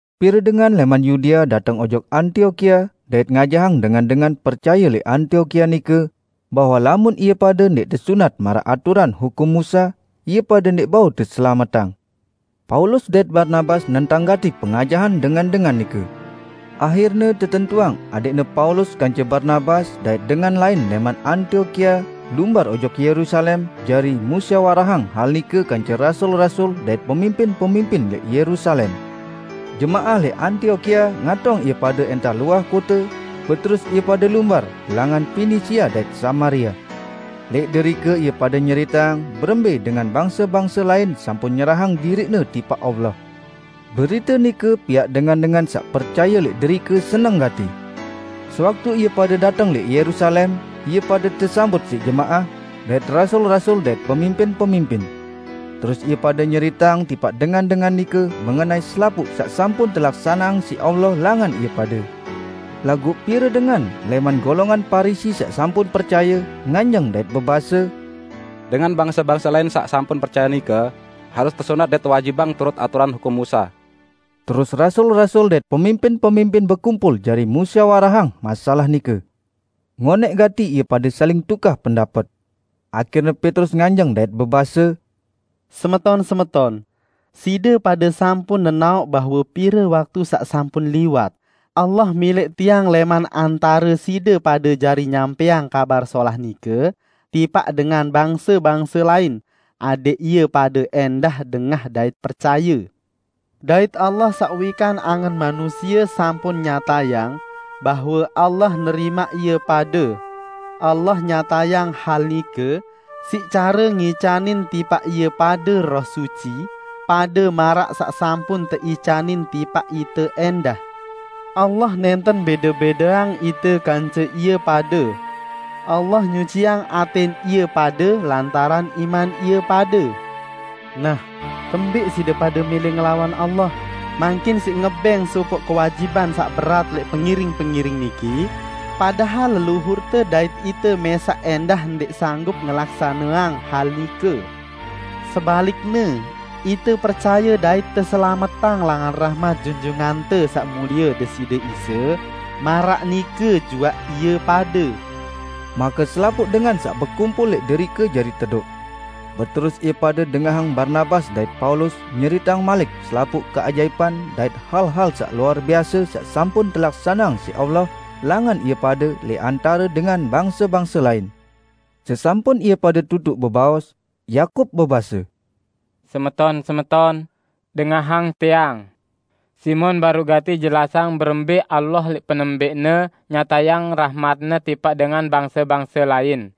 Pire dengan lẽman Yudea dateng ojok Antiokia dait ngajahang dengan-dengan percaye lẽq Antiokia nike bahwe lamun ie pade ndẽq tesunat maraq aturan hukum Musa, ie pade ndẽq bau teselametang. Paulus dait Barnabas nentang gati pengajahan dengan-dengan nike. Ahirne tetentuang adẽqne Paulus kance Barnabas dait dengan lain lẽman Antiokia lumbar ojok Yerusalem jari musyawarahang hal nike kance rasul-rasul dait pemimpin-pemimpin lẽq Yerusalem. Jemaah lẽq Antiokia ngatong ie pade ẽntah luah kote, beterus ie pade lumbar langan Pinisia dait Samaria. Lẽq derike ie pade nyeriteang berembẽ dengan bangse-bangse lain sampun nyerahang diriqne tipaq Allah. Berite nike piaq dengan-dengan saq percaye lẽq derike seneng gati. Sewaktu ie pade dateng lẽq Yerusalem, ie pade tesambut siq jemaah, dait rasul-rasul dait pemimpin-pemimpin. Terus ie pade nyeriteang tipaq dengan-dengan nike mengenai selapuq saq sampun telaksaneang siq Allah langan ie pade. Laguq pire dengan lẽman golongan Parisi saq sampun percaye, nganjeng dait bebase, "Dengan bangse-bangse lain saq sampun percaye nike harus tesunat dait tewajibang turut aturan hukum Musa." Terus rasul-rasul dait pemimpin-pemimpin bekumpul jari musyawarahang masalah nike. Ngonẽq gati ie pade saling tukah pendapet. Ahirne Petrus nganjeng dait bebase, "Semeton-semeton, side pade sampun nenaoq bahwe pire waktu saq sampun liwat Allah milẽq tiang lẽman antare side pade jari nyampẽang Kabar Solah nike tipaq dengan bangse-bangse lain, adẽq ie pade ẽndah dengah dait percaye. Dait Allah saq wikan angen manusie sampun nyatayang bahwe Allah nerimaq ie pade; Allah nyatayang hal nike siq care ngicanin tipaq ie pade Roh Suci, pade maraq saq sampun teicanin tipaq ite ẽndah. Allah nẽnten bẽde-bẽdeang ite kance ie pade. Allah nyuciang atẽn ie pade lantaran iman ie pade. Nah, kembẽq side pade mẽlẽ ngelawan Allah mangkin siq ngebẽng sopoq kewajiban saq berat lẽq pengiring-pengiring niki, padahal leluhurte dait ite mẽsaq ẽndah ndẽq sanggup ngelaksaneang hal nike? Sebalikne, ite percaye dait teselametang langan rahmat Junjungante Saq Mulie Deside Isa, maraq nike juaq ie pade." Make selapuq dengan saq bekumpul lẽq derike jari tedoq. Beterus ie pade dengahang Barnabas dait Paulus nyeriteang malik selapuq keajaipan dait hal-hal saq luar biase saq sampun telaksaneang siq Allah langan ie pade lẽq antare dengan bangse-bangse lain. Sesampun ie pade tutuq bebaos, Yakub bebase, "Semeton-semeton! Dengahang tiang. Simon baruq gati jelasang berembẽ Allah lẽq penembẽqne nyatayang rahmat-Ne tipaq dengan bangse-bangse lain,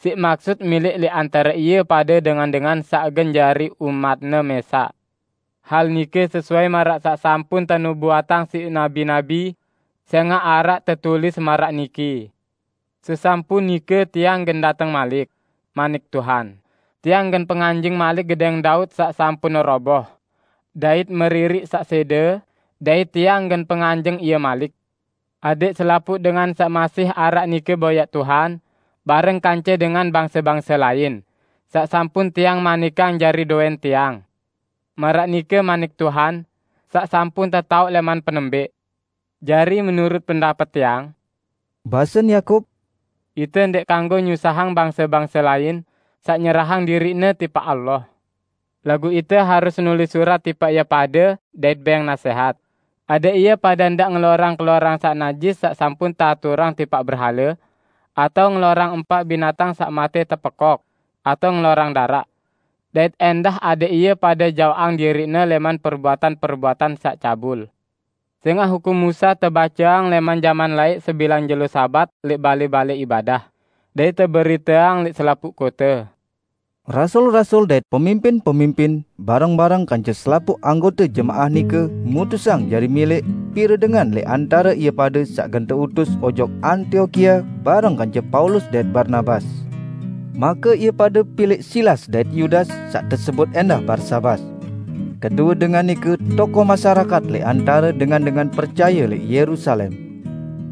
siq maksut milẽq lẽq antare ie pade dengan-dengan saq gen jari umat-Ne mẽsaq. Hal nike sesuai maraq saq sampun tenubuatang siq nabi-nabi. Sẽngaq araq tetulis maraq niki, 'Sesampun nike Tiang gen dateng malik,' manik Tuhan, 'Tiang gen penganjeng malik gedẽng Daud saq sampun roboh, dait meririq saq sẽde, dait Tiang gen penganjeng ie malik; adẽq selapuq dengan saq masih araq nike boyaq Tuhan, bareng kance dengan bangse-bangse lain, saq sampun Tiang manikang jari dowẽn Tiang.' Maraq nike manik Tuhan, saq sampun tetaoq lẽman penembẽq." "Jari menurut pendapet tiang," basen Yakub, "Ite ndẽq kanggo nyusahang bangse-bangse lain saq nyerahang diriqne tipaq Allah. Laguq ite harus nulis surat tipaq ie pade dait bẽng nasẽhat, adẽq ie pade ndaq ngelorang keloran saq najis saq sampun teaturang tipaq berhale, atao ngelorang empaq binatang saq matẽ tepekok, atao ngelorang daraq. Dait ẽndah adẽq ie pade jaoqang diriqne lẽman perbuatan-perbuatan saq cabul. Sẽngaq hukum Musa tebaceang lẽman jaman laẽq sebilang jelo Sabat lẽq balẽ-balẽ ibadah, dait teberiteang lẽq selapuq kote." Rasul-rasul dait pemimpin-pemimpin, bareng-bareng kance selapuq anggote jemaah nike mutusang jari milẽq pire dengan lẽq antare ie pade saq gen teutus ojok Antiokia bareng kance Paulus dait Barnabas. Make ie pade pilẽq Silas dait Yudas saq tesebut ẽndah Barsabas. Kedue dengan nike tokoh masyarakat lẽq antare dengan-dengan percaye lẽq Yerusalem.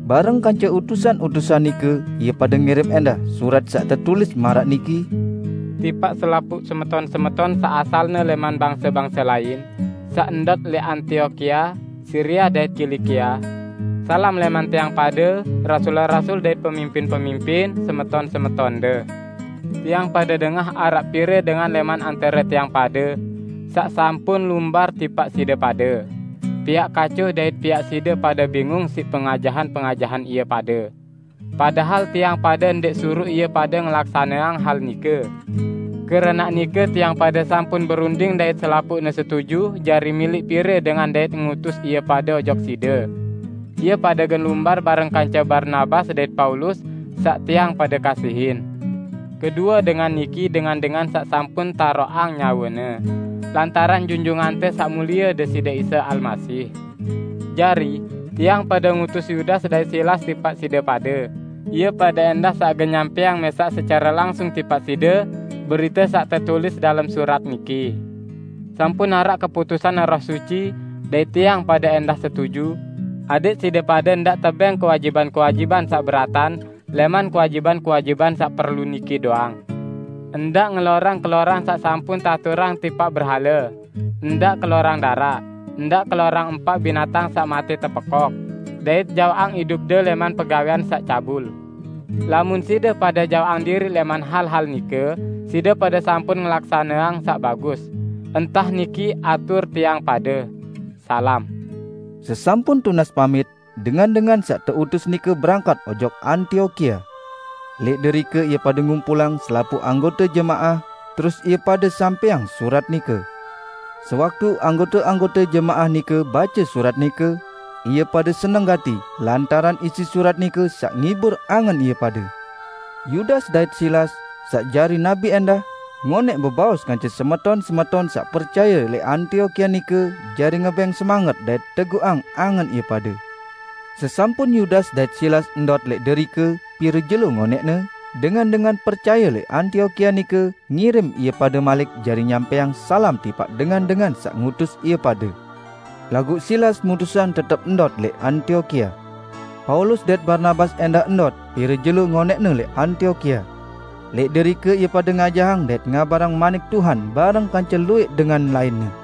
Bareng kance utusan-utusan nike ie pade ngirim ẽndah surat saq tetulis maraq niki, "Tipaq selapuq semeton-semeton saq asalne lẽman bangse-bangse lain, saq ndot lẽq Antiokia, Siria dait Kilikia. Salam lẽman tiang pade, rasul-rasul dait pemimpin-pemimpin, semeton-semetonde. Tiang pade dengah araq pire dengan lẽman antare tiang pade saq sampun lumbar tipaq side pade, piaq kaco dait piaq side pade bingung siq pengajahan-pengajahan ie pade. Padahal tiang pade ndẽq suruq ie pade ngelaksaneang hal nike. Keranaq nike tiang pade sampun berunding dait selapuqne setuju jari milẽq pire dengan dait ngutus ie pade ojok side. Ie pade gen lumbar bareng kance Barnabas dait Paulus saq tiang pade kasihin. Kedue dengan niki dengan-dengan saq sampun taroqang nyawene, lantaran Junjungante Saq Mulie Deside Isa Almasih. Jari, tiang pade ngutus Yudas dait Silas tipaq side pade, ie pade ẽndah saq gen nyampẽang mẽsaq secare langsung tipaq side berite saq tetulis dalem surat niki. Sampun araq keputusan Roh Suci -- dait tiang pade ẽndah setuju -- adẽq side pade ndaq tebẽng kewajiban-kewajiban saq beratan lẽman kewajiban-kewajiban saq perlu niki doang: Ndaq ngelorang keloran saq sampun teaturang tipaq berhale; ndaq kelorang daraq, ndaq kelorang empaq binatang saq matẽ tepekok, dait jaoqang idupde lẽman pegawẽan saq cabul. Lamun side pade jaoqang diriq lẽman hal-hal nike, side pade sampun ngelaksaneang saq bagus. ~Entah niki atur tiang pade. Salam!" Sesampun tunas pamit, dengan-dengan saq teutus nike berangkat ojok Antiokia. Lẽq derike ie pade ngumpulang selapuq anggote jemaah, terus ie pade sampẽang surat nike. Sewaktu anggote-anggote jemaah nike bace surat nike, ie pade seneng gati lantaran isi surat nike saq ngibur angen ie pade. Yudas dait Silas, saq jari nabi ẽndah, ngonẽq bebaos kance semeton-semeton saq percaye lẽq Antiokia nike jari ngebẽng semanget dait teguqang angen ie pade. Sesampun Yudas dait Silas ndot lẽq derike pire jelo ngonẽqne, dengan-dengan percaye lẽq Antiokia nike ngirim ie pade malik jari nyampẽang salam tipaq dengan-dengan saq ngutus ie pade. [ Laguq Silas mutusang tetep ndot lẽq Antiokia.] Paulus dait Barnabas ẽndah ndot pire jelo ngonẽqne lẽq Antiokia. Lẽq derike ie pade ngajahang dait ngabarang manik Tuhan bareng kance luwẽq dengan lainne.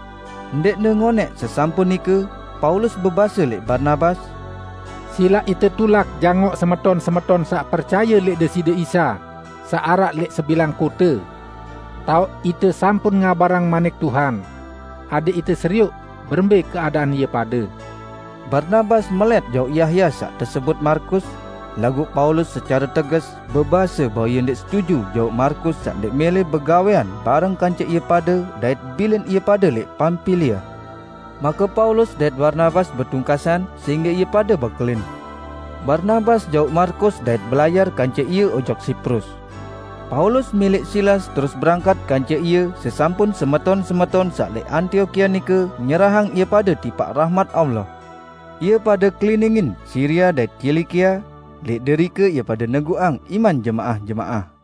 Ndẽqne ngonẽq sesampun nike Paulus bebase lẽq Barnabas, "Silaq ite tulak jangoq semeton-semeton saq percaye lẽq Deside Isa saq araq lẽq sebilang kote, taoq ite sampun ngabarang Manik Tuhan; adẽq ite serioq berembẽ keadaan ie pade." Barnabas melẽt jauq Yahya saq tesebut Markus, laguq Paulus secare teges bebase bahwe ie ndẽq setuju jauq Markus saq ndẽq mẽlẽ begawẽan bareng kance ie pade dait bilin ie pade lẽq Pampilia. Make Paulus dait Barnabas betungkasan sehingge ie pade bekelin: Barnabas jauq Markus dait belayar kance ie ojok Siprus. Paulus milẽq Silas terus berangkat kance ie sesampun semeton-semeton saq lẽq Antiokia nike nyerahang ie pade tipaq rahmat Allah. Ie pade keliningin Siria dait Kilikia; lẽq derike ie pade neguqang iman jemaah-jemaah.